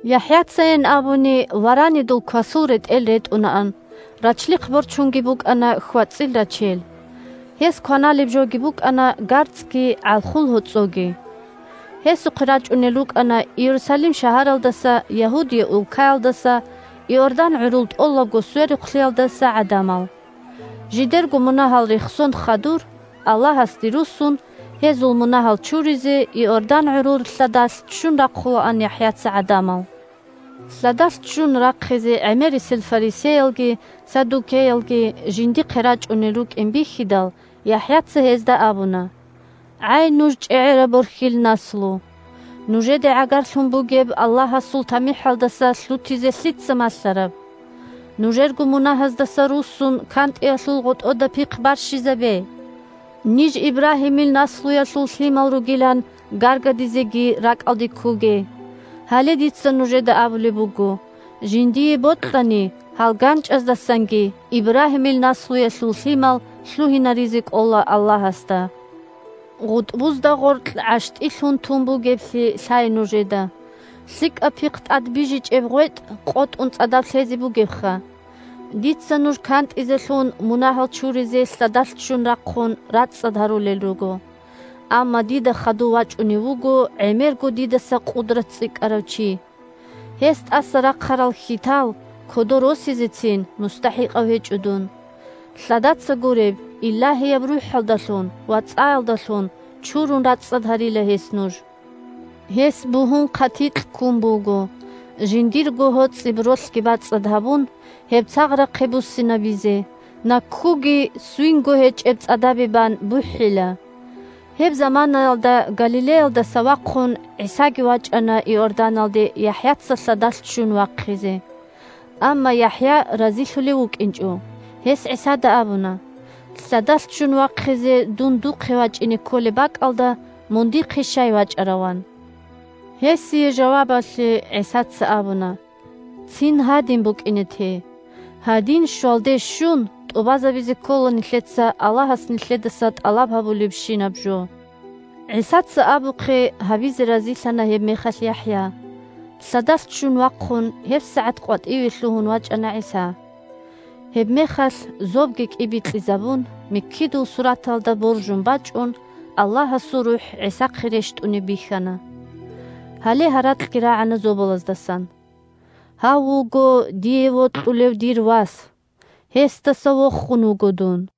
ЯхӀяцайин абуни, варанидул квасул ретӀел ретӀунаан, рачлихъ борчунги букӀана хьвацӀил рачел. Гьес кваналеб жоги букӀана гарцӀги гӀалхул гьоцӀоги. Гьесухъе рачӀунел рукӀана Иерусалим шагьаралдаса, Ягьудия улкаялдаса, Иордан гӀурул тӀолабго сверухълъиялдаса гӀадамал. Жидерго мунагьал рехсон хадур, Аллагьасде руссун, гьезул мунагьал чуризе, Иордан гӀурул лъадалъ ччун рахъулаан ЯхӀяца гӀадамал. Лъадалъ ччун рахъизе гӀемерисел фарисеялги саддукеялги жиндихъе рачӀунел рукӀин бихьидал, ЯхӀяца гьезда абуна: – ГӀай, нуж чӀегӀераб борхьил наслу! Нужеде гӀагарлъун бугеб Аллагьасул тамихӀалдаса лъутизе лъица малъараб? Нужерго мунагьаздаса руссун, кантӀиялъул гъотӀода пихъ барщизабе. Ниж Ибрагьимил наслуялъул лъимал ругилан гаргадизеги ракӀалде ккоге. Гьале дица нужеда абулеб буго: жиндие бокьани, гьал ганчӀаздасанги Ибрагьимил наслуялъул лъимал лъугьинаризе кӀола Аллагьасда. ГъутӀбузда гъоркь гӀащтӀи лъун тун бугеблъи лъай нужеда. ЛъикӀаб пихъ тӀад бижичӀеб гъветӀ къотӀун цӀадаб лъезе бугебха! Дица нуж кантӀизелъун, мунагьал чуризе лъадалъ ччун рахъун, рацӀцӀад гьарулел руго. Амма дида хадув вачӀунев вуго гӀемерго дидаса къудрат цӀикӀкӀарав чи. Гьес тӀаса рахъарал хьитал кодоре росизецин мустахӀикъав гьечӀо дун. Лъадаца гуреб, Илагьияб РухӀалдалъун ва цӀаялдалъун чурун рацӀцӀад гьарила гьес нуж. Гьес бугьун хъатикь ккун буго, жиндирго гьоцӀиб ролъги бацӀцӀад гьабун, гьеб цагърахъе буссинабизе, наккуги ссвинго гьечӀеб цӀадабе бан бухӀила. Гьеб заманаялда Галилеялдаса вахъун ГӀисаги вачӀана Иорданалде ЯхӀяца лъадалъ ччун вахъизе. Амма ЯхӀя разилъулев вукӀинчӀо, гьес ГӀисада абуна: – Лъадалъ ччун вахъизе дун духъе вачӀине кколеб бакӀалда, мун дихъе щай вачӀарав? – ан. Гьесие жавабалъе ГӀисаца абуна: – Цин гьадин букӀине те. Гьадин щвалде щун тӀубазабизе ккола нилъеца Аллагьас нилъедаса тӀалаб гьабулебщинаб жо. ГӀисаца абухъе гьабизе разилъана гьебмехалъ ЯхӀя. Лъадалъ ччун вахъун гьебсагӀат къватӀиве лъугьун вачӀана ГӀиса. Гьебмехалъ зобги кӀибикьизабун, миккидул сураталда боржун бачӀун, Аллагьасул РухӀ ГӀисахъе рещтӀунеб бихьана. Гьале гьаракьги рагӀана зобалаздасан: – Гьав вуго дие вокьулев дир Вас. Гьесдаса вохун вуго дун!